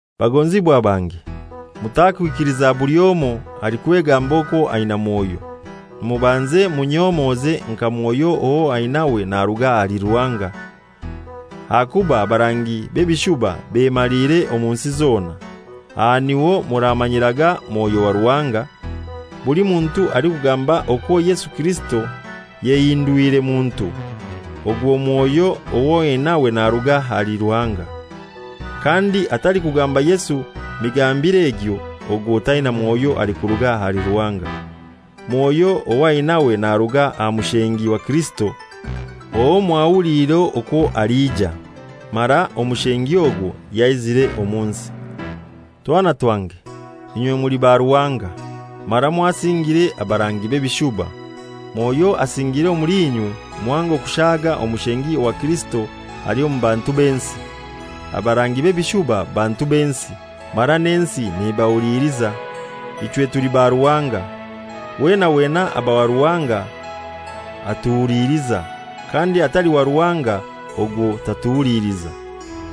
Bagonzibwa bange, mutakwikiliza buli omoi alikwegamba okwo aina Mwoyo. Mubanze munyomoze nka Mwoyo owo ainawe naruga ahali Ruhanga. Ahakuba abarangi b'ebishuba bemaliire omu nsi zona. Aha niho muramanyiraga Mwoyo wa Ruhanga: Buli muntu alikugamba okwo Yesu Kirisito yayehindwire muntu, ogwo Mwoyo ow'ainawe naruga ahali Ruhanga. Kandi atalikugamba Yesu migambire egyo, ogwo taina Mwoyo alikuruga ahali Ruhanga. Mwoyo ow'ainawe naruga aha Mushengi wa Kirisito, owo mwahuliire okwo aliija, mara Omushengi ogwo yaizire omu nsi. Twana twange, inywe muli ba Ruhanga, mara mwasingire abarangi b'ebishuba. Mwoyo asingiire omuli inywe muhango kushaaga Omushengi wa Kirisito ali omu bantu b'ensi. Abarangi b'ebishuba bantu b'ensi, mara n'ensi nebahuliliza. Ichwe tuli ba Ruhanga. Weena wena aba wa Ruhanga atuhuliliza, kandi atali wa Ruhanga ogwo tatuhuliliza.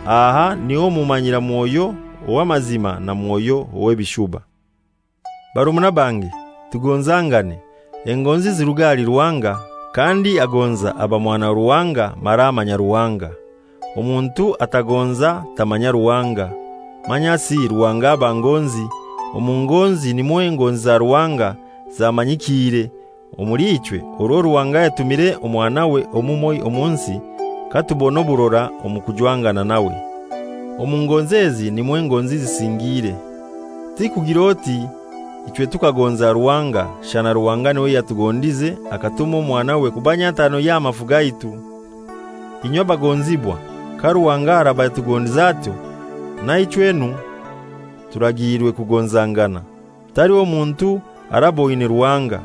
Aha niho mumanyira Mwoyo ow'amazima na mwoyo ow'ebishuba. Barumuna bange, tugonzangane. Engonzi ziruga ahali Ruhanga, kandi agonza aba mwana wa Ruhanga mara amanya Ruhanga. Omuntu atagonza tamanya Ruhanga, manyasi Ruhanga aba ngonzi. Omu ngonzi nimwo engonzi za Ruhanga zamanyikiire omuli ichwe, orwo Ruhanga yatumire Omwanawe omumoi omu nsi, katubona oburora omu kujwangana nawe. Omu ngonzi ezi nimwo engonzi zisingiire: Tikugir'oti ichwe tukagonza Ruhanga, shana Ruhanga niwe yatugondize akatuma Omwanawe kuba nyatano y'amafu gaitu. Inywe abagonzibwa, ka Ruhanga araba yatugondize atyo, na ichwenu turagiirwe kugonzangana. Taliho muntu araboine Ruhanga.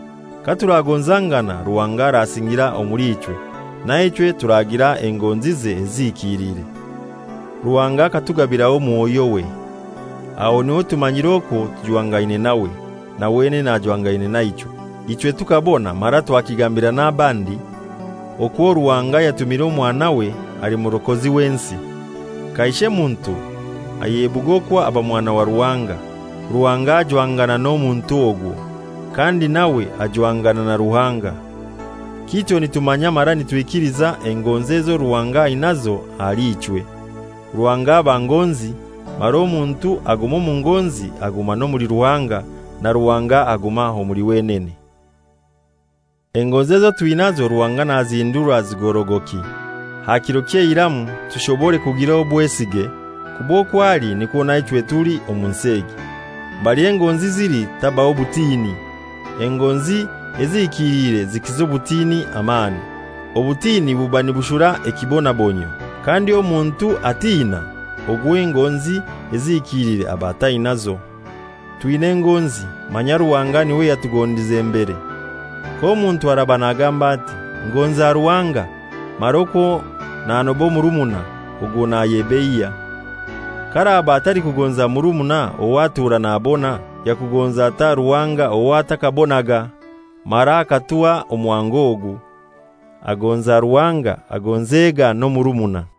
Katuragonzangana, Ruhanga arasingira omuli ichwe, naichwe turagira engonzize ezihikiliire. Ruhanga akatugabiraho Mwoyowe, aho niho tumanyira okwo tujwangaine nawe, na wenene ajwangaine naichwe. Ichwe tukabona mara twakigambira n'abandi okwo Ruhanga yatumire Omwanawe ali Murokozi w'ensi. Kaishe muntu ayebuga okwo aba Mwana wa Ruhanga, Ruhanga ajwangana n'omuntu ogwo, kandi nawe ajwangana na Ruhanga. Kityo nitumanya mara nitwikiliza engonzi ezo Ruhanga ainazo ahali ichwe. Ruhanga aba ngonzi, mara omuntu aguma omu ngonzi aguma n'omuli Ruhanga, na Ruhanga aguma omuli wenene. Engonzi ezo twinazo Ruhanga nazihindura zigorogoki, aha kiro ky'eiramu tushobore kugira obwesige, kuba okwo ali nikwo naichwe tuli omu nsi egi. Mbali engonzi zili tabaho butini. Engonzi ezihikiliire zikiza obutini amani. Obutini buba nibushura ekiibonabonyio, kandi omuntu atina, ogwo engonzi ezihikiliire aba atainazo. Twina engonzi, manya Ruhanga niwe yatugondize mbere. K'omuntu araba nagamba ati, «Ngonza Ruhanga,» mara okwo nanoba omurumuna, ogwo nayebeiya. K'araba atalikugonza murumuna ow'atura nabona, yakugonza atai Ruhanga ow'atakabonaga? Mara akatuha omuhango ogu: Agonza Ruhanga agonzega n'omurumuna.